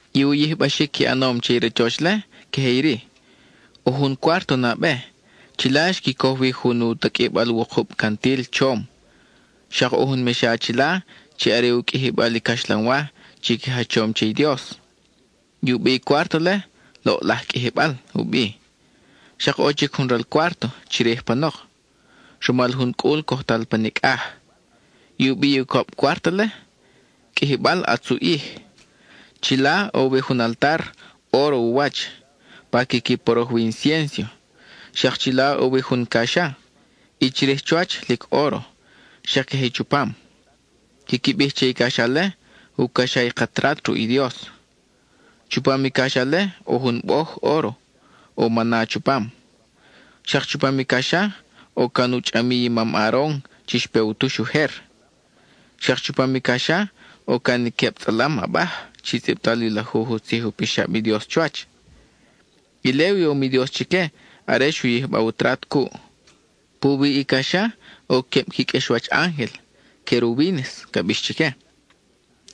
I u yijbaxic qui ʼanom che i rachoch-le, queje iri: ʼo jun cuárto nabe; chila xqui coj wi jun u taqʼuibal wukub cantil chom, xak ʼo jun mexa chila chi are u qʼuijibal i caxlanwa chi qui jachom che i Dios. I u bi i cuárto-le: “Loʼlaj qʼuijibal”, u bi. Xak ʼo chic jun ral cuárto chirij panok, rumal jun cʼul cojtal pa nicʼaj. I u bi i ucab cuárto-le: “Qʼuijibal ʼatz u ʼij.” Chila ʼo wi jun altar, óro u wach, pa quiqui poroj wi i inciénso. Xak chila ʼo wi jun caxa, i chirij chuwach, lic óro, xak queje i chupam. Quiqui bij che i caxa-le: “U caxa i ka trat ruʼ i Dios.” Chupam i caxa-le ʼo jun boj óro, ʼo mana chupam. Xak chupam i caxa ʼo can u chʼamiy i mam Aaron chi xpe u tux ujer. Xak chupam i caxa ʼo can i queb tzʼalam abaj chi tzʼibtal i lajuj u tzij u pixab i Dios chuwach; ile u yom i Dios chique are xu yijba u trat cuʼ. Puwi i caxa ʼo queb qui qʼuexwach ángel, “querubínes” ca bix chique.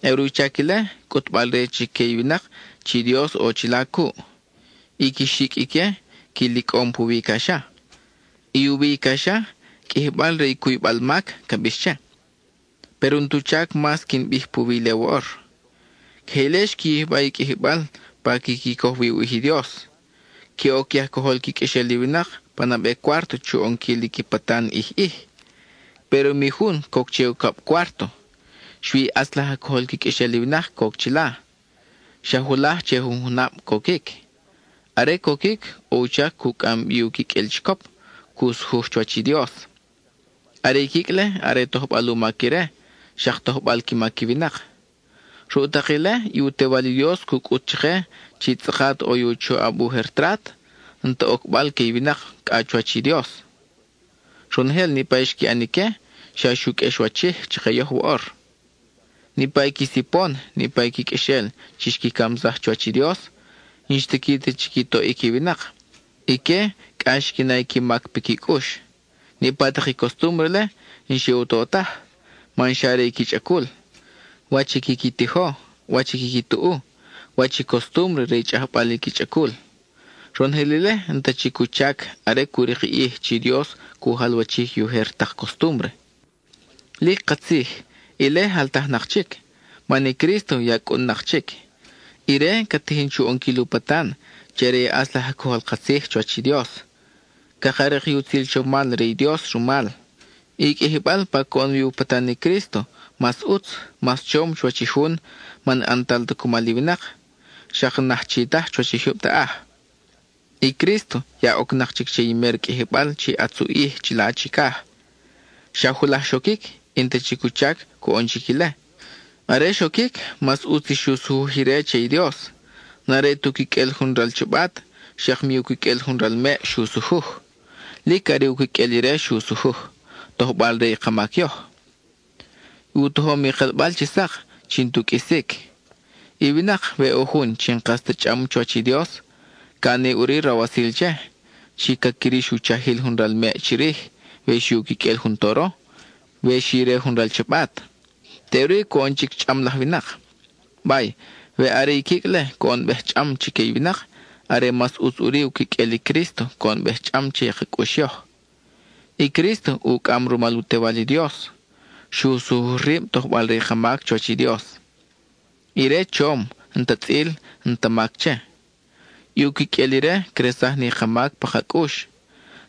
Are u chac ile, cʼutbal-re chique i winak chi i Dios ʼo chila cuʼ. I qui xicʼ ique qui licʼom puwi i caxa. I u wi i caxa, “Qʼuijibal re i cuybal mac” ca bix che. Péro n-tu chac mas quin bij puwi ile woʼor. Queje ile xqui yijba i qʼuijibal pa quiqui coj wi u ʼij i Dios. Que oc i aj cojol qui qʼuexel i winak pa nabe cuárto chu ʼonquil i qui patan ʼij ʼij. Péro mi jun coc che ucab cuárto, xui i ʼatz laj aj cojol qui qʼuexel i winak coc chila; xa julaj che jun junab coquic. Are coquic, ʼo u chac cu cʼam bi u quiqʼuel chicop, cu sujuj chuwach i Dios. Are i quicʼ-le are tojbal u mac ire, xak tojbal qui mac i winak. Ruʼ tak ile, i u Tewal i Dios cu cʼut chake chi tzʼakat ʼo i u choʼab ujer trat, n-ti ocbal que i winak cʼa chuwach i Dios. Ronojel niʼpa i xqui ʼan ique, xa xu qʼuexwachij chake yoj woʼor. Niʼpa i qui sipon, niʼpa i qui qʼuexel chi xqui camsaj chuwach i Dios, n-xtiqui ta chi qui toʼic i winak; ique cʼa xqui na i qui mac piqui cʼux. Niʼpa tak i costúmbre-le, n-xe u to taj, man xa re i qui chʼacul: wach i quiqui tijo, wach i quiqui tuʼu, wach i costúmbre re i chʼajbal i qui chʼacul. Ronojel ile n-ta chic u chac are cu rik i ʼij chi Dios cu jalwachij i ujer tak costúmbre. Lic katzij, ile jaltajnak chic, man i Crísto ya cʼun-nak chic. Ire ca tijin chu ʼonquil u patan chi are ʼatz laj aj cojol ka tzij chuwach i Dios; caka rik i utzil chomal re i Dios rumal. I qʼuijibal pa coʼon wi u patan i Crísto, mas ʼutz, mas chom chuwach i jun, man n-ʼantal ta cumal i winak, xak n-aj chi taj chuwach i jyub taʼaj. I Crísto ya ocnak chic che i mer qʼuijibal chi ʼatz u ʼij, chila chicaj; xa julaj xoquic, y n-ta chic u chac coʼon chic ile. Are xoquic, mas ʼutz i xu sujuj ire che i Dios. N-are tu quiqʼuel jun ral chabat, xak mi u quiqʼuel jun ral meʼ xu sujuj, lic are u quiqʼuel ire xu sujuj, tojbal re i ka mac yoj. U tojom i kelbal chi sak chi n-tu qʼuisic. I winak, we ʼo jun chi n-kas ta chʼam chuwach i Dios, ca ʼani ʼuri rawasil che, chi ca quirix i u chajil jun ral meʼ chirij, we xi u quiqʼuel jun toro, we xi re jun ral chabat. Teʼuri coʼon chic chʼam laj winak. Bay, we are i quicʼ-le coʼonbej chʼam chique i winak, are mas ʼutz ʼuri u quiqʼuel i Crísto coʼonbej chʼam che i ka cʼux yoj. I Crísto, ucʼam rumal i u Tewal i Dios, xu sujuj rib tojbal re ka mac chuwach i Dios. Ire chom, n-ta tzʼil, n-ta mac che. I u quiqʼuel ire cresaj ni ka mac pa ka cʼux.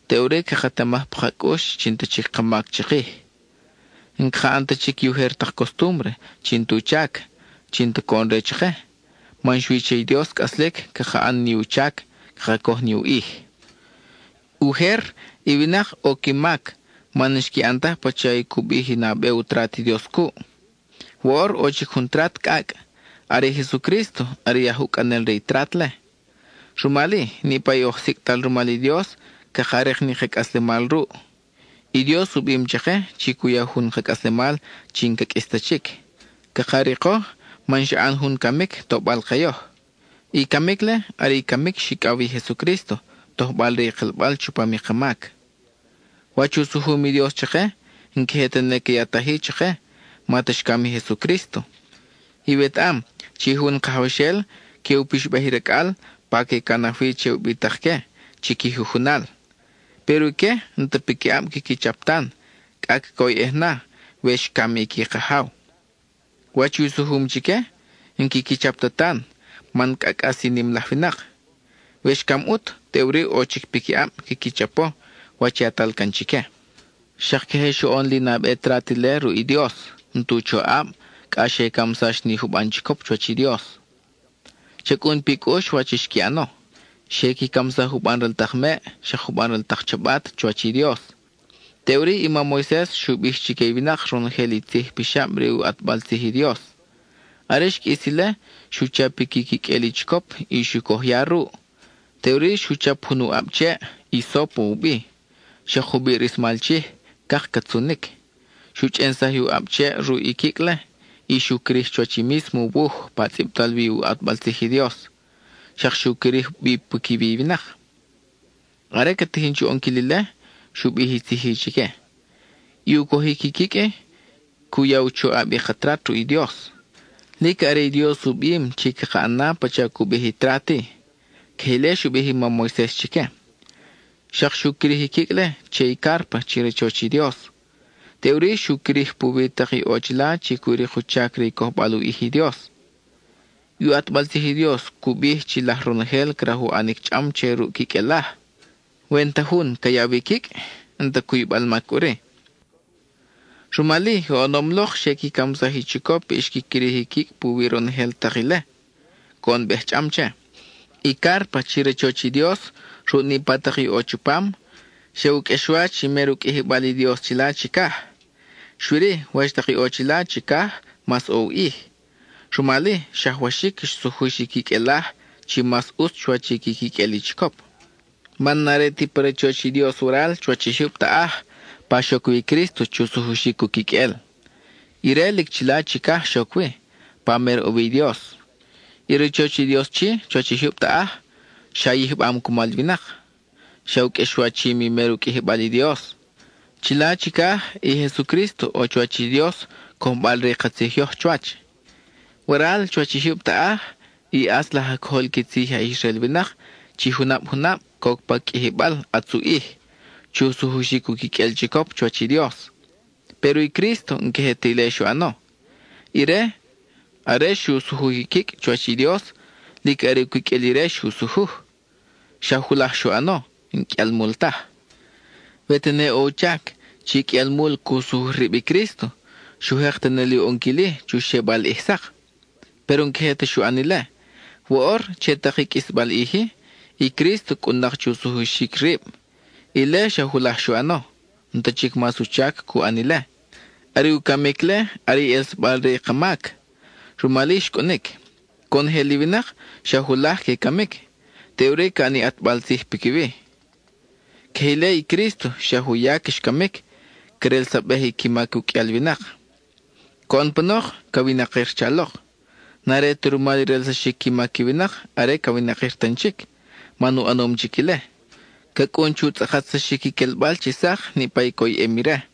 Teʼuri caketamaj pa ka cʼux chi n-ta chic ka mac chikij. N-caka ʼan ta chic i ujer tak costúmbre chi n-tu chac, chi n-ta coʼon-re chake, man xui che i Dios cʼaslic caka ʼan ni u chac, caka coj ni u ʼij. Ujer, i winak ʼo qui mac man n-xqui ʼan taj pacha i cu bij i nabe u trat i Dios cuʼ; woʼor ʼo chic jun trat cʼacʼ. Are i Jesucrísto are i aj ucʼanel re i trat-le. Rumal-i, niʼpa i oj sicʼtal rumal i Dios caka rik ni ka cʼaslemal ruʼ. I Dios u bim chake chi cu ya jun ka cʼaslemal chi n-ca qʼuis ta chic. Caka riko man xa ʼan jun camic tobal ke yoj: i camic-le are i camic xicʼaw wi i Jesucrísto, tojbal re i kelbal chupam i ka mac. Wach u sujum i Dios chake, n-queje tene ca yataj-i chake ma ta xcam i Jesucrísto. Iwetaʼam chi jun kajawxel que u pixbaj i racʼal pa que canaj wi che ubitak que chi qui jujunal. Péro ique n-ta piquiʼab quiqui chap tan, cʼa cacoyʼej na we xcam i qui kajaw. Wach i u sujum chique, n-quiqui chap ta tan, man cʼa cʼas i nim laj winak. We xcam ʼut, teʼuri ʼo chic piquiʼab quiqui chapo wach yatal can chique. Xak queje xoʼon li nabe trat ile ruʼ i Dios, n-tu choʼab, cʼa xe camsax ni juban chicop chuwach i Dios. Cha cʼun pi cʼux wach xqui ʼano: xe qui camsaj juban ral tak meʼ xak juban ral tak chabat chuwach i Dios. Teʼuri i mam Moises xu bij chique i winak ronojel i tzij pixab re u ʼatbal tzij i Dios. Are xqʼuis ile, xu chap i qui quiqʼuel i chicop y xu coj ya ruʼ. Teʼuri xu chap jun u ʼab cheʼ, hisópo u bi, xak jubiʼ rismal chij, cak catzunic; xu chʼensaj i u ʼab cheʼ ruʼ i quicʼ-le, y xu quirij chuwach i mísmo wuj pa tzʼibtal wi u ʼatbal tzij i Dios, xak xu quirij bi piquiwi i winak. Are ca tijin chu ʼonquil ile, xu bij i tzij-i chique: “I u cojic i quicʼ-i, cu ya u choʼab i ka trat ruʼ i Dios. Lic are i Dios u bim chi chaka ʼana pacha cu bij i trat-i.” Queje ile xu bij i mam Moises chique. Xak xu quirij i quicʼ-le che i cárpa chi rachoch i Dios. Teʼuri xu quirij puwi tak i ʼo chila chi cu rik u chac re cojbal u ʼij i Dios. I u ʼatbal tzij i Dios cu bij chi laj ronojel craj u ʼanic chʼam che ruʼ quiqʼuelaj. We n-ta jun ca yaw i quicʼ, n-ta cuybal mac ʼuri. Rumal-i, oʼonom lok xe qui camsaj i chicop y xqui quirij i quicʼ puwi ronojel tak ile, coʼonbej chʼam che. I cárpa chi rachoch i Dios, ruʼ niʼpa tak i ʼo chupam, xa u qʼuexwach i mer u qʼuijibal i Dios chila chicaj. Xui-ri, wach tak i ʼo chila chicaj mas ʼo u ʼij, rumal-i, xajwaxic xsujux i quiqʼuelaj chi mas ʼutz chuwach i qui quiqʼuel i chicop. Man n-are ti pa rachoch i Dios waral chuwach i jyub taʼaj pa xoc wi i Crísto chu sujuxic u quiqʼuel; ire lic chila chicaj xoc wi, pa mer ʼo wi i Dios. I rachoch i Dios chi, chuwach i jyub taʼaj, xa yijbam cumal i winak, xa u qʼuexwachim i mer u qʼuijibal i Dios. Chila chicaj, i Jesucrísto ʼo chuwach i Dios cojbal-re i ka tzij yoj chuwach. Waral chuwach i jyub taʼaj, i ʼatz laj aj cojol qui tzij i aj Israel winak chi junab junab coc pa Qʼuijibal ʼatz u ʼij, chu sujuxic u quiqʼuel chicop chuwach i Dios. Péro i Crísto n-queje ti ile xu ʼano. Ire, are xu sujuj i quicʼ chuwach i Dios, lic are u quiqʼuel ire xu sujuj. Xa julaj xu ʼano, n-qʼuialmul taj. We tene ʼo u chac chi qʼuialmul cu sujuj rib i Crísto, xu jek tene li u ʼonquil-i chu xebal li ʼij sak. Péro n-queje ta xu ʼan ile. Woʼor, che tak i qʼuisbal ʼij-i, i Crísto cʼun-nak chu sujuxic rib; ile xa julaj xu ʼano, n-ta chic mas u chac cu ʼan ile. Are u camic-le, are i ʼelsabal re i ka mac; rumal-i xcʼunic. Conojel i winak, xa julaj que camic, teʼuri ca ʼan ni ʼatbal tzij piquiwi. Queje ile i Crísto xa juyac xcamic, crelsabej qui mac u qʼuial winak. Coʼon panok ca winakir chalok. N-are ta rumal i relsaxic qui mac i winak are ca winakir tan chic, man u ʼanom chic ile. Ca cʼun chu tzʼakatsaxic i quelbal chi sak niʼpa i coyʼem ire.